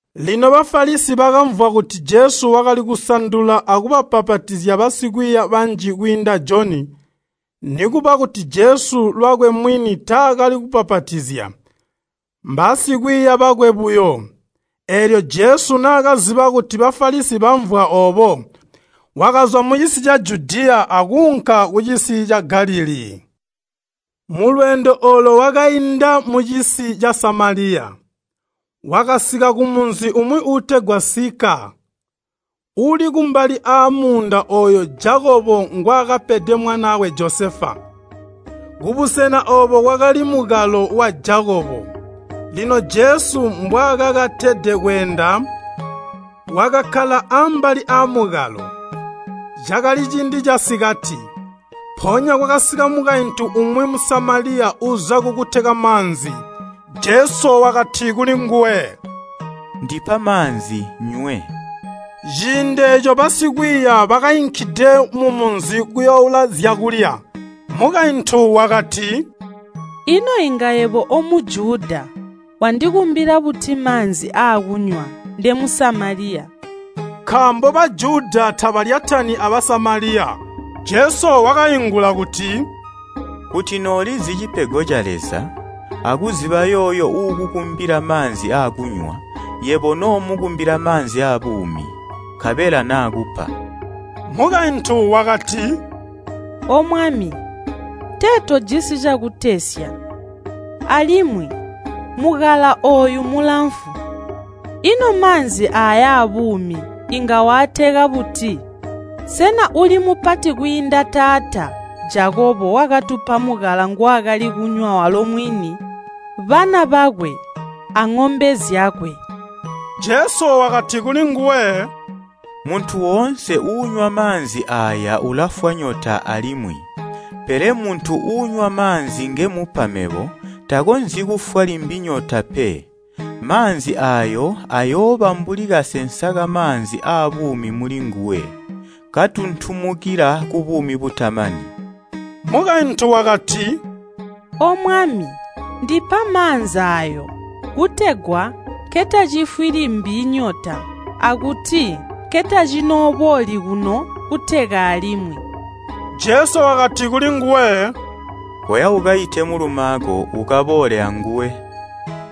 Lino Bafalisi bakamvwa kuti Jesu wakali kusandula akubbapatizya basikwiiya banji kwiinda Joni. (Nikuba kuti Jesu lwakwe mwini taakali kubbapatizya, mbaasikwiiya bakwe buyo.) Eelyo Jesu naakaziba kuti Bafalisi bamvwa oobo, wakazwa mucisi ca Judiya akuunka kucisi ca Galilii. Mulweendo oolo wakainda mucisi ca Samaliya. Wakasika kumunzi umwi uutegwa Sikaa, uuli kumbali aamuunda ooyo Jakobo ngwaakapede mwanaakwe Josefa. Kubusena oobo kwakali mukalo wa Jakobo. Lino Jesu mbwaakakatede kweenda, wakakkala ambali aamukalo. Cakali ciindi casikati. Mpoonya kwakasika mukaintu umwi Musamaliya uza kukuteka maanzi. Jesu wakati kulinguwe, “Ndipa maanzi nnywe.” Ciindi eeco basikwiiya bakainkide mumunzi kuyooula zyakulya. Mukaintu wakati, “Ino inga yebo o Mujuda wandikumbila buti maanzi aakunywa nde Musamaliya?” (Nkaambo Bajuda tabalyatani a Basamaliya). Jesu wakaingula kuti, “Kuti noolizi cipego ca Leza, akuziba yooyo uukukumbila maanzi aakunywa, yebo noomukumbila maanzi aabuumi, nkabela naakupa.” Mukaintu wakati, “Omwami, tee tojisi cakutesya, alimwi mukalo ooyu mulamfu, ino maanzi aayo aabuumi inga waateka buti? Sena uli mupati kwiinda taata Jakobo wakatupa mukalo ngwaakali kunywa walo mwini, bana bakwe aŋombe zyakwe?” Jesu wakati kulinguwe, “Muntu woonse uunywa maanzi aaya ulafwa nyota alimwi. Pele muntu uunywa maanzi ngemupa mebo, takonzyi kufwa limbi nyota pe. Maanzi aayo aayooba mbuli kasensa kamaanzi aabuumi mulinguwe, katuntumukila kubuumi butamani.” Mukaintu wakati, “Omwami, ndipa maanzi aayo, kutegwa nkentacifwi limbi nyota, akuti nkentacinoobooli kuno kuteka alimwi.” Jesu wakati kulinguwe, “Koya ukaite mulumaako, ukaboole anguwe.”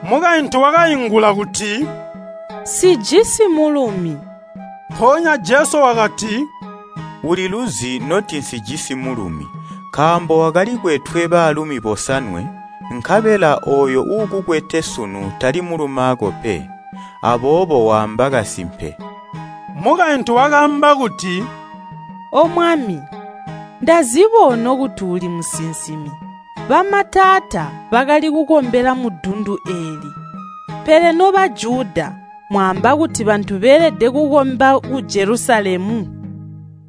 Mukaintu wakaingula kuti, “Nsijisi mulumi.” Mpoonya Jesu wakati, “Uliluzi noti nsijisi mulumi, nkaambo wakali kwetwe baalumi bosanwe, nkabela ooyo uukukwete sunu tali mulumaako pe. Aboobo waamba kasimpe.” Mukaintu wakaamba kuti, “Omwami, ndaziba ono kuti uli musinsimi. Bamataata bakali kukombela mudundu eeli, pele no Bajuda mwaamba kuti bantu beelede kukomba ku Jelusalemu.”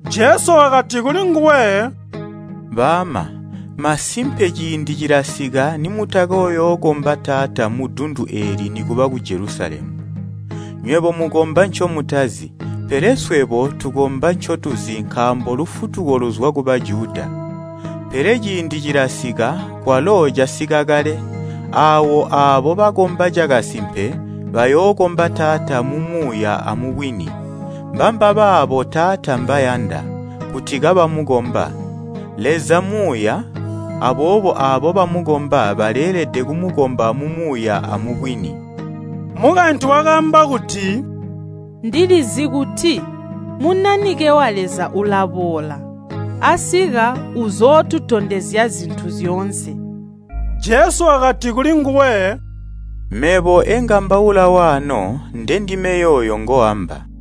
Jesu wakati kulinguwe, “Baama, masimpe ciindi cilasika nimutakoyookomba Taata mudundu eeli nikuba ku Jelusalemu. Nywebo mukomba ncomutazi, pele swebo tukomba ncotuzi nkaambo lufutuko luzwa ku Bajuda. Pele ciindi cilasika, kwalo casika kale, aawo aabo bakomba cakasimpe bayookomba Taata mumuuya amubwini. Mbambabaabo Taata mbayanda, kuti kabamukomba. Leza Muuya, aboobo aabo bamukomba baleelede kumukomba mumuuya amubwini.” Mukaintu wakaamba kuti, “Ndilizi kuti Munanike wa Leza ulaboola, asika uzootutondezya zintu zyoonse.” Jesu wakati kulinguwe, “Mebo engambaula waano ndendime yooyo ngooamba.”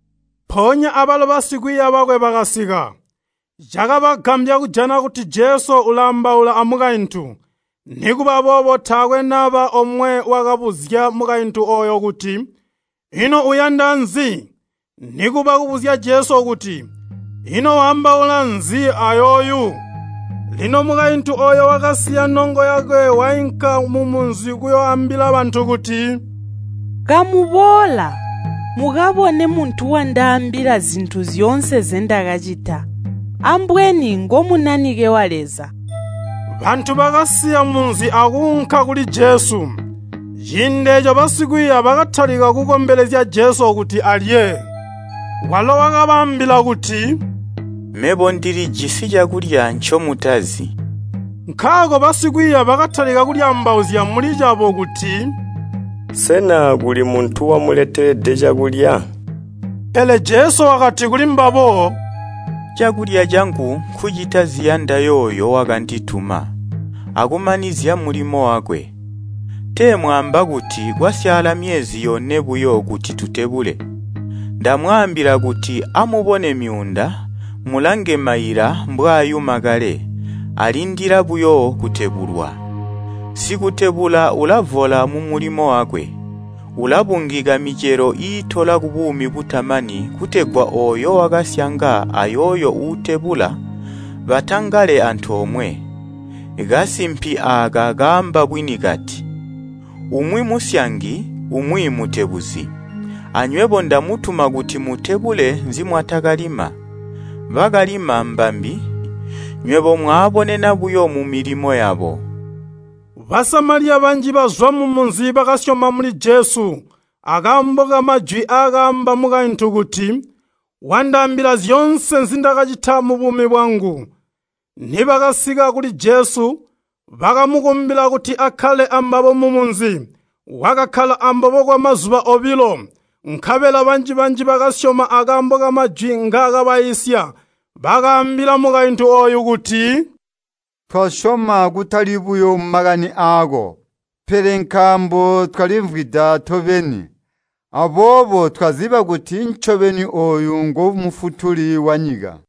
Mpoonya abalo basikwiiya bakwe bakasika. Cakabagambya kujana kuti Jesu ulaambaula amukaintu. Nikuba boobo taakwe naba omwe wakabuzya mukaintu ooyo kuti, “Ino uyanda nzi?” Nikuba kubuzya Jesu kuti, “Ino waambaula nzi ayooyu?” Lino mukaintu ooyo wakasiya nongo yakwe wainka mumunzi kuyooambila bantu kuti, “Kamuboola, mukabone muntu wandaambila zintu zyoonse nzendakacita. Ambweni ngo Munanike wa Leza?” Bantu bakasiya munzi akuunka kuli Jesu. Ciindi eeco basikwiiya bakatalika kukombelezya Jesu kuti alye. Walo wakabaambila kuti, “Mebo ndilijisi cakulya ncomutazi.” Nkaako basikwiiya bakatalika kulyaambauzya muli cabo kuti, “Sena kuli muntu wamuletelede cakulya?” Pele Jesu wakati kulimbabo, “Cakulya cangu nkucita ziyanda yooyo wakandituma, akumanizya mulimo wakwe. Tee mwaamba kuti, ‘Kwasyaala myezi yone buyo kuti tutebule.’ Ndamwaambila kuti amubone myuunda, mulange maila mbwaayuma kale, alindila buyo kutebulwa. Sikutebula ulavola mumulimo wakwe, ulabungika micelo iitola kubuumi butamani kutegwa ooyo wakasyanga ayooyo uutebula batangale antoomwe. Kasimpi aaka kaamba bwini kati, ‘Umwi musyangi, umwi mutebuzi.’ Anywebo ndamutuma kuti mutebule nzimwatakalima. Bakalima mbambi, nywebo mwaabonena buyo mumilimo yabo.” Basamaliya banji bazwa mumunzi bakasyoma muli Jesu akaambo kamajwi aakaamba mukaintu kuti, “Wandaambila zyoonse nzindakacita mubuumi bwangu.” Nibakasika kuli Jesu, bakamukumbila kuti akkale ambabo mumunzi. Wakakkala ambabo kwamazuba obilo. Nkabela banji-banji bakasyoma akaambo kamajwi ngaakabaiisya. Bakaambila mukaintu ooyo kuti, “Twasyoma kutali buyo makani aako, pele nkaambo twalimvwida tobeni, aboobo twaziba kuti ncobeni ooyu ngo Mufutuli wanyika.”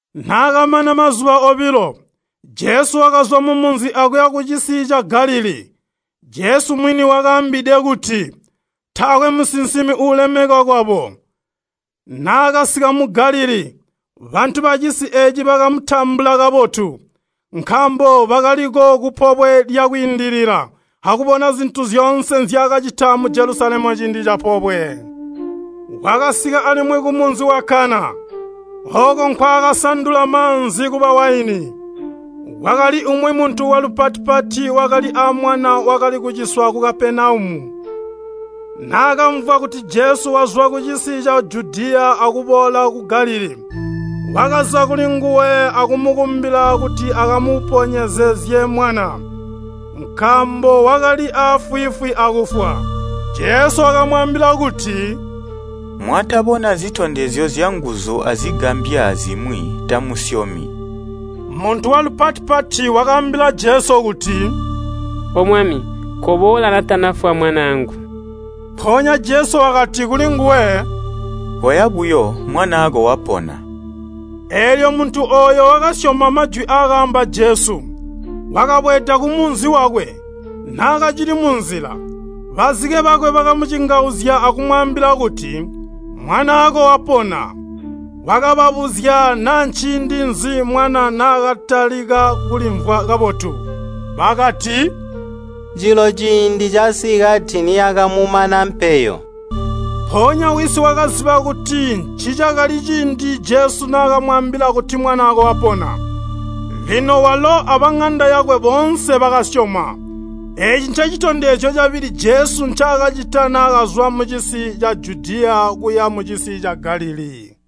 Naakamana mazuba obilo, Jesu wakazwa mumunzi akuya kucisi ca Galilii. Jesu mwini wakaambide kuti, “Taakwe musinsimi uulemekwa kwabo.” Naakasika mu Galilii, bantu bacisi eeci bakamutambula kabotu, nkaambo bakaliko ku Pobwe lya Kwiindilila akubona zintu zyoonse nzyaakacita mu Jelusalemu ciindi capobwe. Wakasika alimwi kumunzi wa Kana, ooko nkwaakasandula maanzi kuba waini. Kwakali umwi muntu walupati-pati wakali aamwana wakali kuciswa ku Kapenaumu. Naakamvwa kuti Jesu wazwa kucisi ca Judiya akuboola ku Galilii, wakaza kulinguwe akumukumbila kuti akamuponyezezye mwana, nkaambo wakali aafwiifwi akufwa. Jesu wakamwaambila kuti, “Mwatabona zitondezyo zyanguzu azigambya zimwi tamusyomi.” Muntu walupati-pati wakaambila Jesu kuti, “Omwami, koboola natanafwa mwanaangu.” Mpoonya Jesu wakati kulinguwe, “Koya buyo, mwanaako wapona.” Eelyo muntu ooyo wakasyoma majwi aakaamba Jesu, wakabweeda kumunzi wakwe. Naakacili munzila, bazike bakwe bakamucingauzya akumwaambila kuti, “Mwanaako wapona.” Wakababuzya naa nciindi nzi mwana naakatalika kulimvwa kabotu. Bakati, “Jilo ciindi casikati naakatalika kulimvwa kabotu.” Mpoonya wisi wakaziba kuti ncicakali ciindi Jesu naakamwaambila kuti “Mwanaako wapona.” Lino walo abaŋanda yakwe boonse bakasyoma. Eeci ncecitondezyo cabili Jesu ncaakacita naakazwa mucisi ca Judiya kuya mucisi ca Galilii.